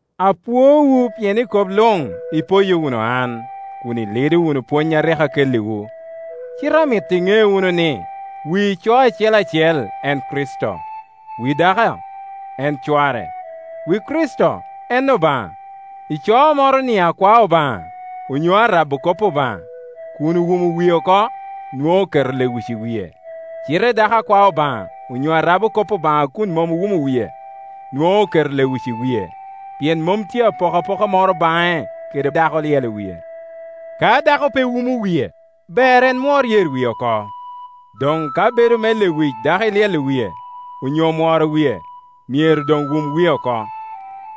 Apwoowu pien i kop luŋ ipoyo wunu an, kun ilido wunu pwony a rik akelliwu. Cite amito iŋe wunu ni wi ico acel acel en Kricito, wi dako en cware, wi Kricito en Obaŋa. Ico moro-ni a kwao Obaŋa, onyo a rabo kop Obaŋa, kun owumo wie oko nwoŋo oketo lewic i wie; cite dako a kwao Obaŋa onyo a rabo kop Obaŋa a kun mom owumo wie, nwoŋo oketo lewic i wie, pien mom tye apoka poka moro baŋe kede dako olyelo wie. Ka dako pe wumo wie, ber en mwor yer wie oko. Doŋ ka bedo me lewic dako ilyelo wie, onyo mworo wie, myero doŋ wum wie oko.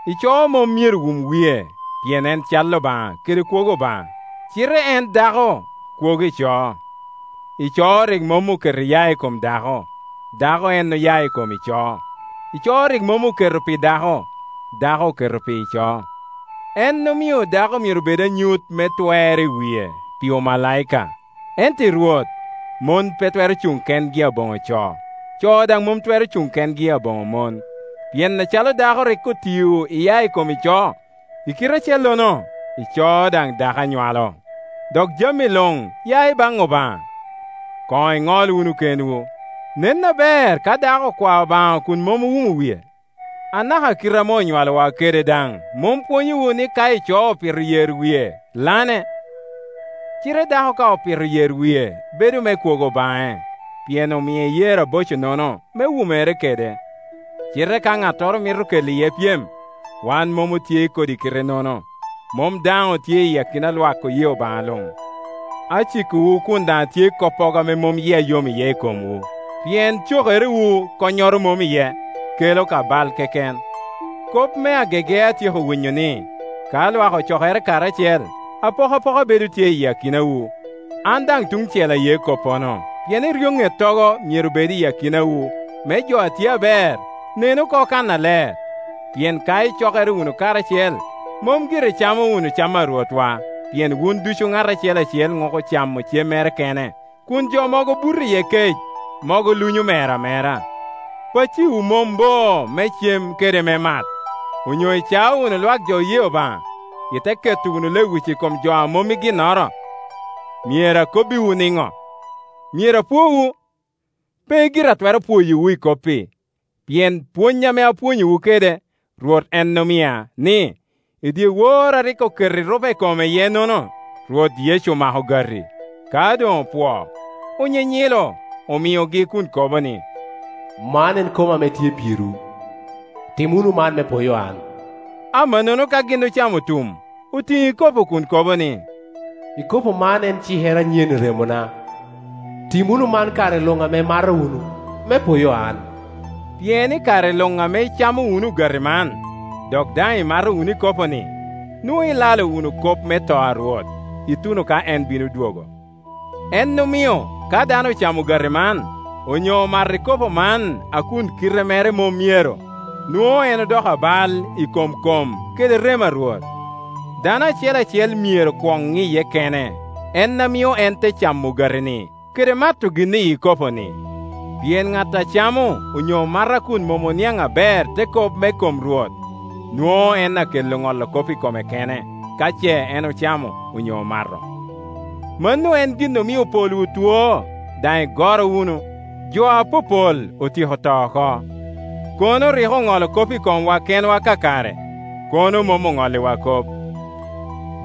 Ico mom myero wum wie, pien en cal Obaŋa kede kwogo Obaŋa; cite en dako kwogo ico. Ico rik mom oketo iya i kom dako, dako en ame oya i kom ico. Ico rik mom oketo pi dako, dako oketo pi ico. En omio dako myero bed anyut me twer i wie, pi omalaika. Ento i Rwot, mon pe twero Cuŋ kengi aboŋo co, co daŋ mom twero Cuŋ kengi aboŋo mon; pien acalo dako rik otio iya ikom ico, i kite acellono ico daŋ dako a nywalo, dok jami luŋ ya i baŋ Obaŋa. Koŋ iŋol wunu kenwu; nen aber ka dako okwao Obaŋa kun mom owumo wie? Anaka kite ame onywalowa kede daŋ mom pwonyowu ni ka ico opito yer wie, lane? Cite dako ka opito yer wie bedo me kwogo baŋe, pien omie yer aboco-nono me wumere kede. Cite ka ŋattoro mito kela iye pyem, wan mom otye i kodi kite-nono, mom daŋ tye i akina lwak jo oye Obaŋa luŋ. Acikowu kun daŋ atye i koppogo ame mom yia yom iye i komwu, pien cokerewu konnyoro mom iye, kela ka bal keken. Kop me agege atyeko winyo ni, ka lwak ocokere karacel, apokapoka bedo tye i akinawu. An daŋ tuŋ cel aye koppono, pien eryoŋettogo myero bed i akinawu, me jo a tye aber nen oko kannaler. Pien ka icokere wunu karacel mom gire icamo wunu cam a Rwotwa, pien wun ducu ŋat acel acel ŋuko camo cemmere kene, kun jo mogo buto iye kec, mogo luŋyo mer amera. Pacciwu mom bo, me cem kede me mat? Onyo icao wunu lwak jo oye Obaŋa, ite keto wunu lewic i kom jo a mom i ginnoro? Myero akobbiwu niŋo? Myero apwowu? Pe gire atwero pwoyowu i kop-pi! Pien pwony ame apwonyowu kede, Rwot en omia, ni, i dyewor a rik oketo erupe i kome iye-nono, Rwot Yecu omako ogati; ka doŋ opwoo, onyinyilo, omiogi kun kobo ni, “Man en koma ame tye pirwu. Tim wunu man me poyo an,” Amannono ka gin ocamo otum, otiŋo ikopo kun kobo ni, “Ikopo man en cikere anyen i remona. Tim wunu man kare luŋ ame imato wunu, me poyo an.” Pien i kare luŋ ame icamo wunu ogati man, dok daŋ imato wunu ikopo-ni, nwoŋo ilalo wunu kop me to a Rwot, ituno ka en bino dwogo. En omio ka dano ocamo ogati man, onyo omato ikopo man a kun kite mere mom myero, nwoŋo en odoko abal i kom kom kede remo a Rwot. Dano acel acel myero kwon ŋiye kene, en amio en te camo ogati-ni kede mato gin iyi ikopo-ni. Pien ŋat a camo onyo mato a kun mom oniaŋ aber te kop me kom Rwot, nwoŋo en akelo ŋolo kop i kome kene ka ce en ocamo onyo omato. Mano en gin omio polwu two, daŋ igoro wunu, jo apopol otyeko to oko. Kono rik oŋolo kop i komwa kenwa kakare, kono mom oŋolliwa kop.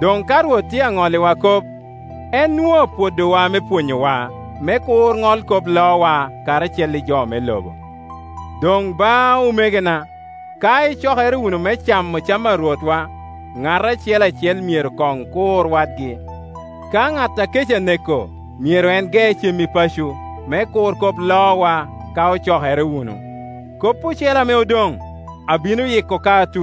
Doŋ ka Rwot tye aŋolliwa kop, en nwoŋo apwodowa me pwonyowa, me kur ŋol kop loowa karacel i jo me lobo. Doŋ ba, omegona, ka icokere wunu me camo cam a Rwotwa, ŋat acel acel myero koŋ kur wadgi. Ka ŋat a kec aneko, myero en ge cem i paco, me kur kop lowa ka ocokere wunu. Kop ocele ame odoŋ, abino yiko